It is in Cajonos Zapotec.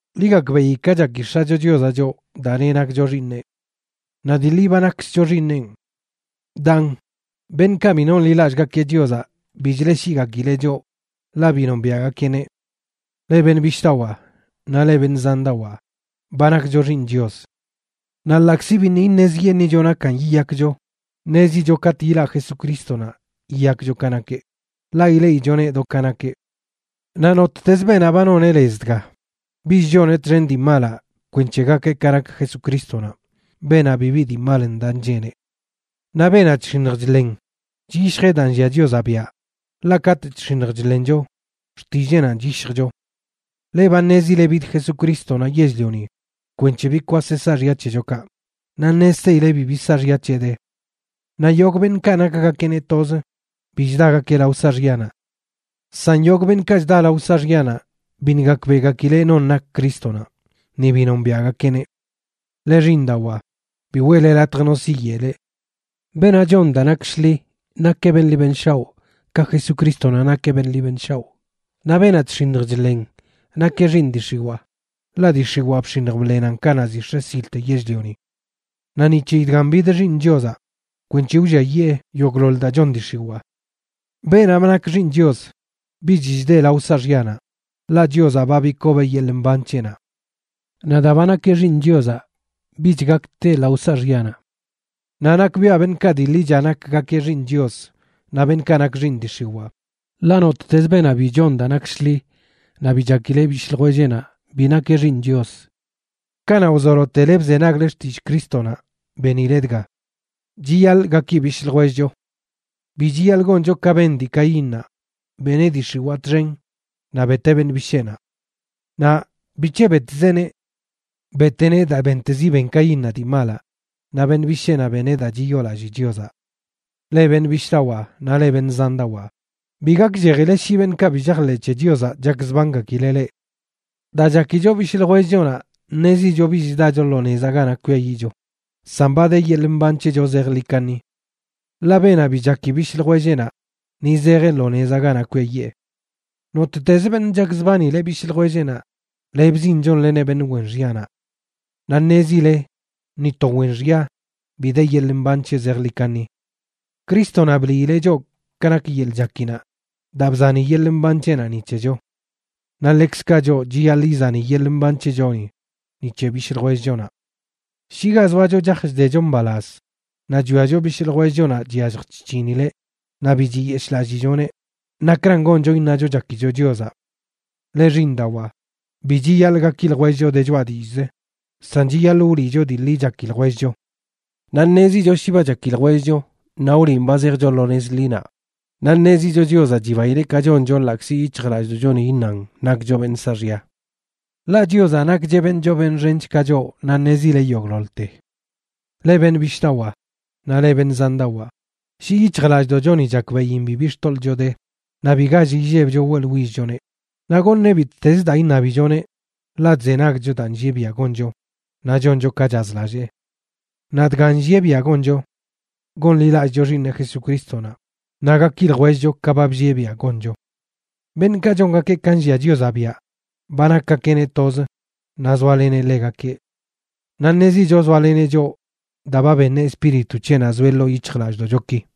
Ḻi gakbeꞌi ka chaki X̱acho Chiozaꞌ choꞌ daa neꞌ nakcho xiiṉeꞌ. Naꞌ dii ḻi ba nakkzcho xiiṉenꞌ. Daan, beṉꞌkaꞌ bi nonḻilallꞌgakeꞌ Chiozaꞌ bi chleꞌshiꞌgakileꞌ choꞌ, ḻaꞌ bi nombiaꞌgakeꞌneꞌ. Leꞌ beṉꞌ bishꞌdawaa naꞌ leꞌ beṉꞌ zandawaa, ba nakcho xiiṉ Chios. Naꞌ ḻaꞌkzi biṉꞌ iṉezyeṉꞌicho nakan yiyakcho, ṉezicho katꞌ yilaꞌ Jesucrístonaꞌ yiyakcho ka nakeꞌ, ḻaꞌ ileꞌichoneꞌ do ka nakeꞌ. Naꞌ nottez beenaꞌ ba noneꞌ lez dga, bich choneꞌ txen dii malaꞌ kwenc̱he gakeꞌ ka nak Jesucrístonaꞌ, beenaꞌ bibi dii mal ndaꞌ ncheneꞌ. Naꞌ beenaꞌ chx̱iṉj chḻen chyishjeꞌ daa nllia Chiozaꞌ biaꞌ, ḻaꞌ katꞌ chx̱iṉj chḻencho, xtilleenanꞌ chyishjcho. Leꞌ ba ṉezile bid Jesucrístonaꞌ yell-lioni kwenc̱he bikwaseꞌ saaxya c̱hechokaꞌ, naꞌ ṉezteile bibi saaxya c̱heꞌ de. Naꞌ yogꞌ beṉꞌkaꞌ nakgakeꞌneꞌ toz bi chdagakeꞌ lao saaxyanaꞌ. San yogꞌ beṉꞌkaꞌ chda lao saaxyanaꞌ biṉꞌ gakbeꞌgakileꞌ non nak Crístonaꞌ, ni bi nombiaꞌgakeꞌneꞌ. Leꞌ xiiṉdawaa, bi weꞌle latj no siyeꞌ leꞌ. Beenaꞌ chon daa nak shḻi nakeꞌ beṉꞌ ḻi beṉꞌ shaoꞌ ka Jesucrístonaꞌ nakeꞌ beṉꞌ ḻi beṉꞌ shaoꞌ. Naꞌ beenaꞌ chx̱iṉj chḻen nakeꞌ xiiṉ dii x̱iwaa, ḻaꞌ dii x̱iwaa bx̱iṉj bḻenan kanaꞌ ziꞌ x̱e silte yell-lioni. Naꞌ ni c̱heyi dgan bid Xiiṉ Chiozaꞌ, kwenc̱he wlliayee yogꞌḻoḻ daa chon dii x̱iwaa. Beenaꞌ ba nak xiiṉ Chios bich chdeꞌ lao saaxyanaꞌ, ḻaꞌ Chiozaꞌ ba bikobeꞌ yeḻꞌ mban c̱heꞌnaꞌ. Naꞌ daa ba nakeꞌ xiiṉ Chiozaꞌ, bich gak teꞌ lao saaxyanaꞌ. Naꞌ nakbiaꞌ beṉꞌkaꞌ dii ḻicha nakgakeꞌ xiiṉ Chios naꞌ beṉꞌkaꞌ nak xiiṉ dii x̱iwaa. Ḻaꞌ nottez beenaꞌ bi chon daa nak shḻi naꞌ bi chakileꞌ bishꞌ ljwelleꞌnaꞌ bi nakeꞌ xiiṉ Chios. Kanaꞌ wzolotele bzenagle xtillꞌ Crístonaꞌ benile dga: chiyaḻꞌ gaki bishꞌ ljwellcho. Bi chiyaḻꞌ goncho ka ben dii Caínnaꞌ, beneꞌ dii x̱iwaa txen naꞌ beteꞌ beṉꞌ bisheenaꞌ. Naꞌ ¿bic̱he betzeꞌneꞌ? Beteꞌneꞌ daa bentezi ben Caínnaꞌ dii malaꞌ, naꞌ beṉꞌ bisheenaꞌ beneꞌ daa chiyoolallii Chiozaꞌ. Leꞌ beṉꞌ bishꞌdawaa naꞌ leꞌ beṉꞌ zandawaa, bi gakllejile shi beṉꞌkaꞌ bi chajḻeꞌ c̱he Chiozaꞌ chakzbangakileꞌ leꞌ. Daa chakicho bishꞌ ljwellchonaꞌ ṉezicho bich chdacho lo nezaꞌ ganaꞌ kwiayiꞌcho, san ba de yeḻꞌ mban c̱hecho zejḻi kaṉi. Ḻaꞌ beenaꞌ bi chaki bishꞌ ljwelleꞌnaꞌ ni zejeꞌ lo nezaꞌ ganaꞌ kwiayee. Nottez beṉꞌ chakzbanileꞌ bishꞌ ljwelleꞌnaꞌ, lebzin chonleneꞌ beṉꞌ wen xyanaꞌ. Naꞌ ṉezile ni to wen xya bi de yeḻꞌ mban c̱heꞌ zejḻi kaṉi. Crístonaꞌ bliileꞌ choꞌ ka nak yeḻꞌ chakinaꞌ daa bzani yeḻꞌ mban c̱heꞌnaꞌ ni c̱hecho. Naꞌ ḻekzkaꞌ choꞌ chiyaḻꞌ izani yeḻꞌ mban c̱hechoni ni c̱he bishꞌ ljwellchonaꞌ. Shi ga zoacho chaj chdecho mbalaz naꞌ chwiacho bishꞌ ljwellchonaꞌ chyallj chc̱hinileꞌ naꞌ bi chiyeshꞌlallichoneꞌ, ¿nakran goncho iṉacho chakicho Chiozaꞌ? Leꞌ xiiṉdawaa, bi chiyaḻꞌ gaki ljwellcho de choꞌa dillꞌz, san chiyaḻꞌ wliꞌcho dii ḻi chaki ljwellcho. Naꞌ ṉezicho shi ba chaki ljwellcho, naꞌ wliꞌn ba zejcho lo nez ḻinaꞌ, naꞌ ṉezicho Chiozaꞌ chibaileꞌ ka choncho, ḻaꞌkzi yic̱hjlallꞌdoꞌchoni iṉan nakcho beṉꞌ saaxya. Ḻaꞌ Chiozaꞌ nakcheꞌ beṉꞌ choo beṉꞌ xench ka choꞌ naꞌ ṉezileꞌ yogꞌḻoḻte. Leꞌ beṉꞌ bishꞌdawaa naꞌ leꞌ beṉꞌ zandawaa, shi yic̱hjlallꞌdoꞌchoni chakbeꞌin bibi xtoḻꞌcho de, naꞌ bi gall illebcho weꞌḻwillchoneꞌ, naꞌ goṉeꞌ bittezə daa iṉabichoneꞌ, ḻaꞌ chzenagcho daa nllieꞌ biaꞌ goncho naꞌ choncho ka chazlallee. Naꞌ dgan nllieꞌ biaꞌ goncho: gonḻilallꞌcho Xiiṉeꞌ Jesucrístonaꞌ, naꞌ gaki ljwellcho ka ba bllieꞌ biaꞌ goncho. Beṉꞌkaꞌ chongakeꞌ ka nllia Chiozaꞌ biaꞌ ba nakgakeꞌneꞌ toz naꞌ zoaleneꞌ ḻegakeꞌ. Naꞌ ṉezicho zoaleneꞌ choꞌ daa ba beṉeꞌ Espíritu c̱heꞌnaꞌ zoeꞌ ḻoo yic̱hjlallꞌdoꞌchoki.